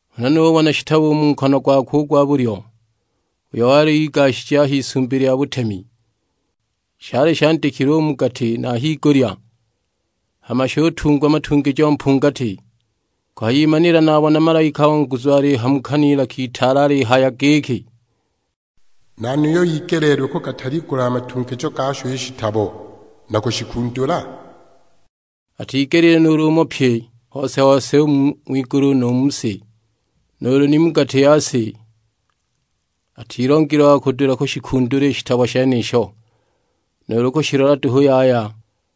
Huna nubona shitabo u mu nkono gwakwe u gwa bulyo, uyo wali igashije a h'Isumbi lya butemi. Shali shandikilwe u mu gati na a higulya, hama shutungwa matungijo mpungati. Kuhayimanila nabona malaika wa nguzu alihamuka n'ilaka itaale alihaya giki, "Nani uyo igeleelilwe kugataligula a matungijo gasho i shitabo, na kushikundula?" Atigelile nuulu umo, pye hose na hose u ng'wigulu nu mu si, nuulu ni mu gati ya si; atilongile wa kudula kushikundula i shitabo shenisho, nuulu kushilola duhu yaya!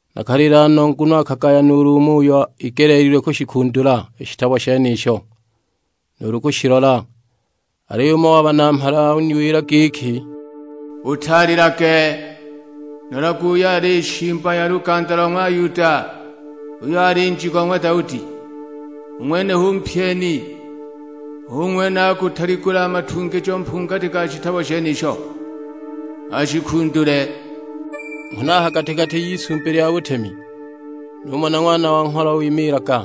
Nakalila no nguno akagaya nuulu umo, uyo igeleelilwe kushikundula i shitabo shenisho, nuulu kushilola! Aliyo umo wa Banamhala uniwila giki, utalilage; nolage uyo ali Shimba ya luganda lo ng'wa Yuda, uyo ali Nji go ng'wa Daudi. U ng'wenuyo hu mpyeni, hu ng'wene akugataligula a matungijo mpungati ga shitabo shenisho, ashikundule! Huna a ha gati-gati y'Isumbi lya butemi numona Ng'wana wa Ngholo wimiilaga,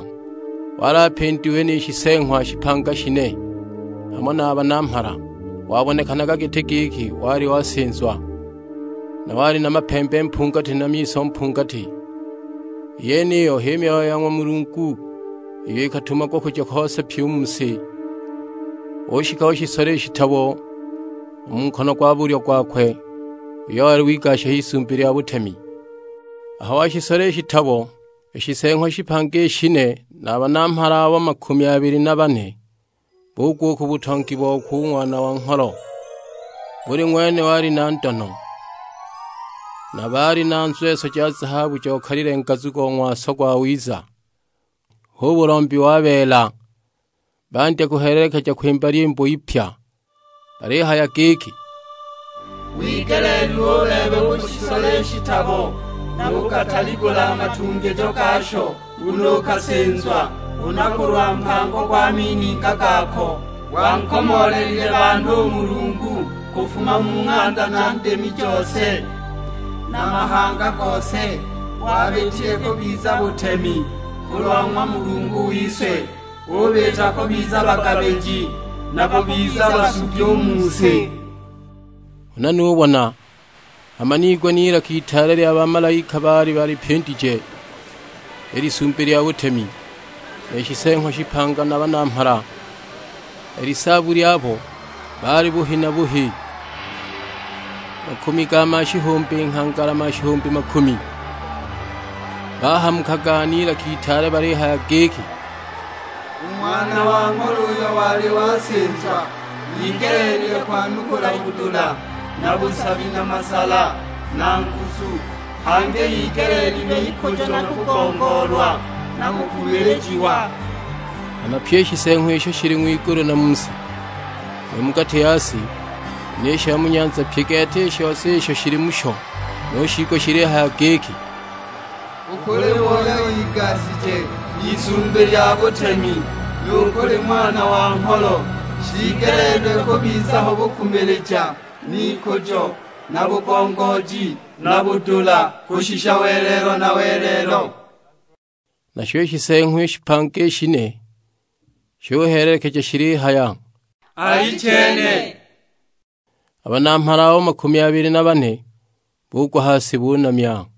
wali apindiwe ni Shiseeng'wa shipanga i shine, hamo na a Banamhala. Wabonekanaga giti giki wali wasinzwa, na wali na mapembe mpungati na miso mpungati. I yeniyo h'i Myoyo ya ng'wa Mulungu iyo ikatumagwa kuja hose pyi u mu si. Ushika ushisola i shitabo u mu nkono gwa bulyo gwakwe uyo wali wigasha h'Isumbi lya butemi. Aho washisola i shitabo, i Shiseeng'wa shipanga i shine na a Banamhala abo makumi abili na bane bugwa u ku butongi bokwe u Ng'wana wa Ngholo. Buli ng'wene wali na ndono; na baali na nzweso ja zahabu jokalile ngazu go ng'waso gwawiza, hu bulombi wa beela. Bandya kuhelelekeja kwimba lyimbo ipya; balihaya giki, "Wigeleelilwe u bebe kushisola i shitabo, nu kugataligula a matungijo gasho, nguno ukasinzwa. Huna kulwa mpango gwa mininga gako wankomoolelile banhu u Mulungu, kufuma mu ng'anda na ndimi jose, na mahanga gose. Wabiitile kubiza butemi kulwa ng'wa Mulungu wise; ubiita kubiza bagabiji, na bakubiza basugi u mu si." Huna nubona, hama niigwa n'ilaka itaale lya bamalaika baali balipindije i Lisumbi lya butemi, ni Shiseeng'wa shipanga na a Banamhala. I lisaabu lyabo baali buhi na buhi, makumi ga mashihumbi, nghangala mashihumbi makumi! Bahamukaga n'ilaka itaale balihaya giki, "U Ng'wana wa Ngholo uyo wali wasinzwa igeleelilwe kwanukula budula na busabi na masala, na nguzu. Hangi igeleelilwe ikujo na kugongoolwa, na kukumilijiwa!" Hama pyi i shiseeng'wa isho shili ng'wigulu na mu si, nu mu gati ya si, ni sha mu nyanza: pye gete i shose isho shili musho nushiigwa shilihaya giki, "U kuli we uyo igashije h'Isumbi lya butemi, nu kuli Ng'wana wa Ngholo, shiigeleelilwe kubiza ho bukumilija, n'ikujo, na bugongooji, na budula; kushisha welelo na welelo!" Nasho i Shiseeng'wa shipanga i shine shuhelelekeja shilihaya, "Alichene." A Banamhala abo makumi abili na bane bugwa ha si bunamya.